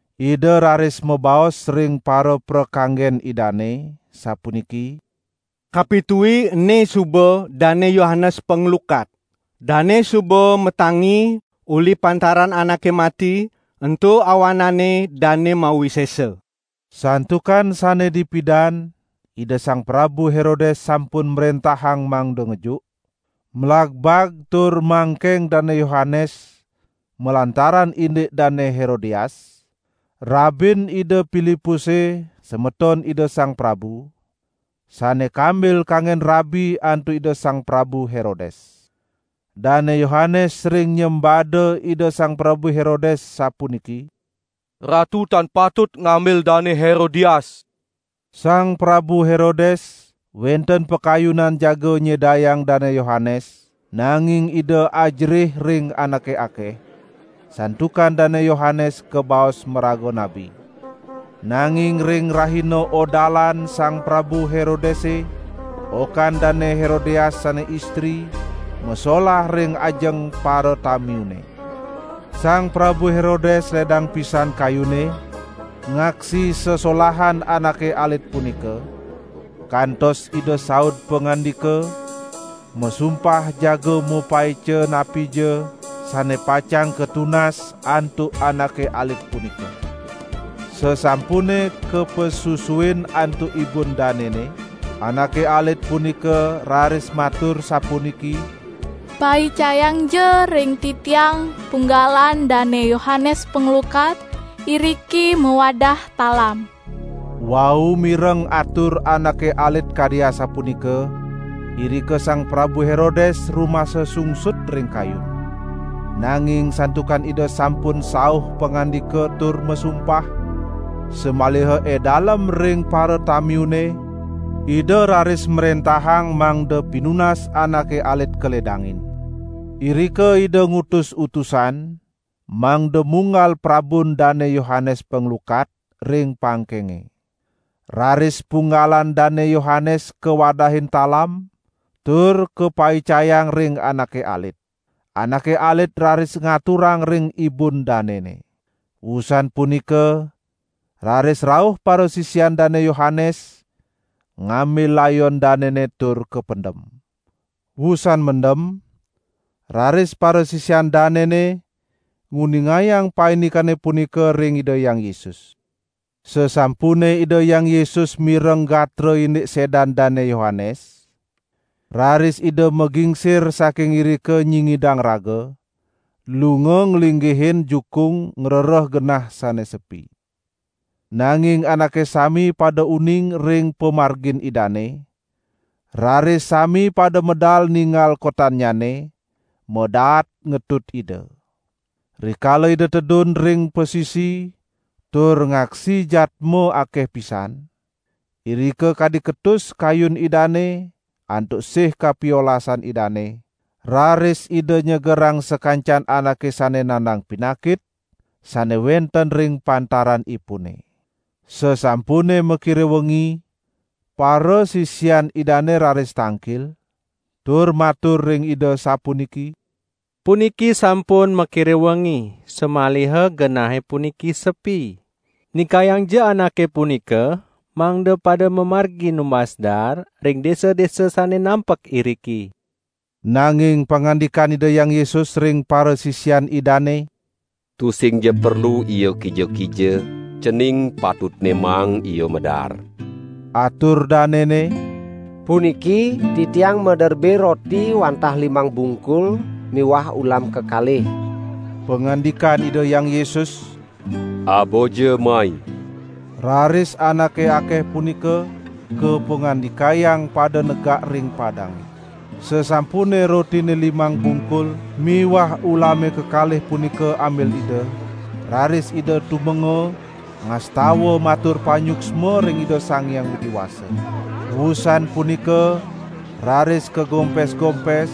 Ida raris mabaos ring paraprakanggen idane sapuniki: "Kapitui ene suba Dane Yohanes Panglukat. Dane suba matangi uli pantaran anake mati, ento awanane dane mawisesa." Santukan sane dipidan Ida Sang Prabu Herodes sampun mrentahang mangda ngejuk, mlagbag tur mangkeng Dane Yohanes malantaran indik Dane Herodias, rabin Ida Pilipuse semeton ida sang prabu, sane kambil kanggen rabi antuk Ida Sang Prabu Herodes. Dane Yohanes sering nyembada Ida Sang Prabu Herodes sapuniki: "Ratu tan patut ngambil Dane Herodias." Sang Prabu Herodes wenten pakayunan jaga nyedayang Dane Yohanes nanging ida ajerih ring anake akeh, santukan Dane Yohanes kabaos maraga nabi. Nanging ring rahina odalan Sang Prabu Herodese, okan Dane Herodias sane istri masolah ring ajeng paratamiune. Sang Prabu Herodes ledang pisan kayunne ngaksi sesolahan anake alit punika, kantos ida saud pangandika, masumpah jaga mapaica napija sane pacang katunas antuk anake alit punika. Sasampune kapasusuin antuk ibun danene, anake alit punika raris matur sapuniki: "Paicayangja ring titiang punggalan Dane Yohanes Panglukat iriki mawadah talam." Wau mireng atur anake alit kadi asapunika, irika Sang Prabu Herodes rumasa sungsut ring kayun. Nanging santukan ida sampun sauh pangandika tur masumpah, samaliha edalem ring paratamiune, ida raris mrentahang mangda pinunas anake alit kaledangin. Irika ida ngutus utusan mangda munggal prabun Dane Yohanes Panglukat, ring pangkenge. Raris punggalan Dane Yohanes kawadahin talam, tur kapaicayang ring anake alit. Anake alit raris ngaturang ring ibun danene. Wusan punika raris rauh parasisian Dane Yohanes ngambil layon danene tur kapendem. Wusan mendem raris parasisian danene nguningayang paindikane punika ring Ida Hyang Yesus. Sasampune Ida Hyang Yesus mireng gatra indik sedan Dane Yohanes, raris Ida magingsir saking irika nyingidang raga, lunga nglinggihin jukung ngrereh genah sane sepi. Nanging anake sami pada uning ring pamargin Idane, raris sami pada medal ninggal kotannyane, madaat ngetut Ida. Rikala Ida tedun ring pasisi tur ngaksi jadma akeh pisan, irika kadi ketus kayun Idane antuk sih kapiolasan Idane, raris Ida nyegerang sakancan anake sane nandang pinakit sane wenten ring pantaranipune. Sasampune makire wengi, parasisian Idane raris tangkil tur matur ring Ida sapuniki: "Puniki sampun makire wengi, samaliha genahe puniki sepi. Nikayangja anake punika mangda pada mamargi numbas daar ring desa-desa sane nampek iriki!" Nanging pangandikan Ida Hyang Yesus ring parasisian Idane: "Tusingja perlu ia kija-kija, cening patutne maang ia madaar." Atur danene: "Puniki titiang maderbe roti wantah limang bungkul miwah ulam kekalih." Pangandikan Ida Hyang Yesus: "Abaja mai!" Raris anake akeh punika kapangandikayang pada negak ring padange. Sasampune rotine limang bungkul miwah ulame kekalih punika ambil Ida, raris Ida tumenga, ngastawa matur panyuksma ring Ida Sang Hyang Widi Wasa. Wusan punika raris kagompes-gompes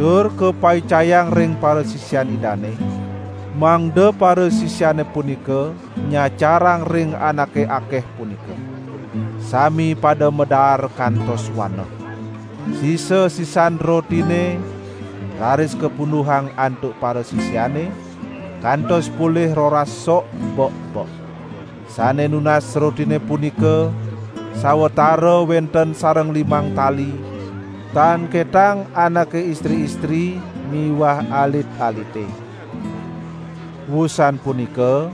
tur kapaicayang ring parasisian Idane, mangda parasisiane punika nyacarang ring anake akeh punika. Sami pada madaar kantos waneh. Sisa-sisan rotine raris kapunduhang antuk parasisiane, kantos polih roras sok bek-bek. Sane nunas rotine punika sawatara wenten sareng limang tali, tan ketang anake istri-istri miwah alit-alite. Wusan punika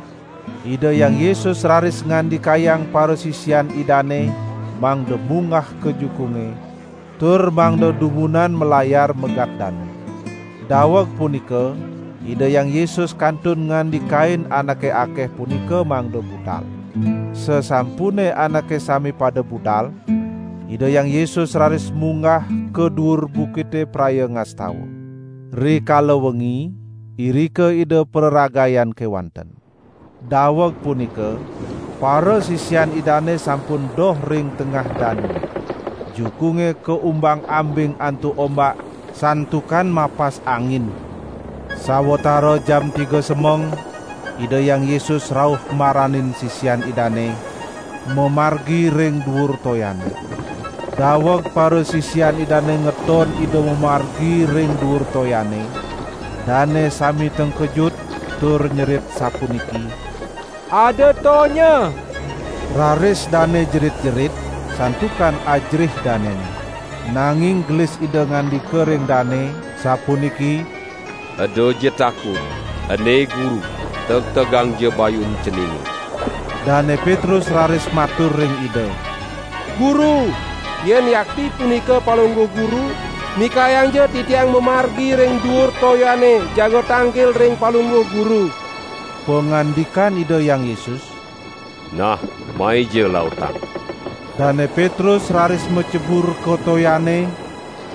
Ida Hyang Yesus raris ngandikayang parasisian Idane mangda munggah ka jukunge tur mangda dumunan malayar megat danu. Daweg punika Ida Hyang Yesus kantun ngandikain anake akeh punika mangda budal. Sasampune anake sami pada budal, Ida Hyang Yesus raris munggah ka duur bukite praya ngastawa. Rikala wengi, irika Ida praragayan kewanten. Daweg punika parasisian Idane sampun doh ring tengah danune. Jukunge kaumbang-ambing antuk ombak, santukan mapas angin. Sawatara jam tiga semeng Ida Hyang Yesus rauh maranin sisian Idane, mamargi ring duur toyane. Daweg parasisian Idane ngeton Ida mamargi ring duur toyane, dane sami tengkejut, tur nyerit sapuniki: "Ada tonya." Raris dane jerit-jerit, santukan ajerih danene. Nanging gelis Ida ngandika ring dane, sapuniki: "Edaja takut! Ene Guru, tegtegangja bayun ceninge!" Dane Petrus raris matur ring Ida: "Guru, yen yakti punika Palungguh Guru, nikayangja titiang mamargi ring duur toyane jaga tangkil ring Palungguh Guru." Pangandikan Ida Hyang Yesus: "Nah maija lautang!" Dane Petrus raris macebur ka toyane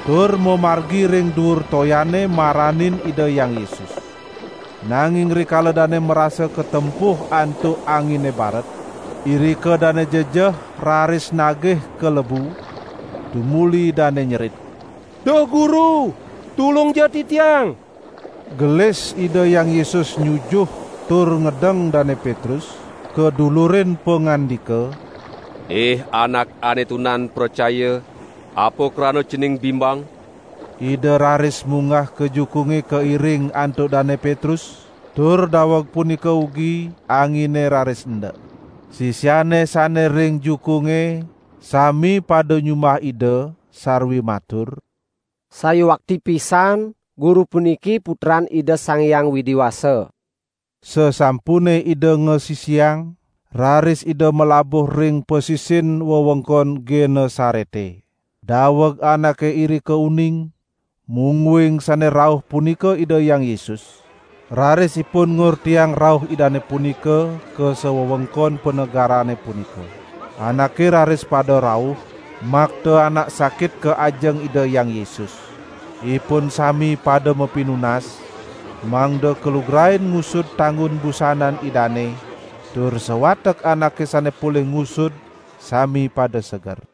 tur mamargi ring duur toyane maranin Ida Hyang Yesus. Nanging rikala dane marasa katempuh antuk angine baret, irika dane jejeh raris nagih kalebu, tumuli dane nyerit: "Duh Guru tulungja titiang!" Gelis Ida Hyang Yesus nyujuh tur ngedeng Dane Petrus kadulurin pangandika: "Ih anak ane tunan pracaya, apa krana cening bimbang?" Ida raris munggah ka jukunge kairing antuk Dane Petrus, tur daweg punika ugi angine raris endek. Sisiane sane ring jukunge sami pada nyumbah Ida sarwi matur: "Sayuakti pisan Guru puniki Putran Ida Sang Hyang Widi Wasa." Sasampune Ida ngasisiang raris Ida malabuh ring pasisin wewengkon Genesarete. Daweg anake irika uning mungguing sane rauh punika Ida Hyang Yesus, raris ipun ngortiang rauh Idane punika ka sawewengkon panegarane punika. Anake raris pada rauh makta anak sakit ka ajeng Ida Hyang Yesus. Ipun sami pada mapinunas mangda kalugrain ngusud tanggun busanan Idane, tur sawatek anake sane polih ngusud sami pada seger.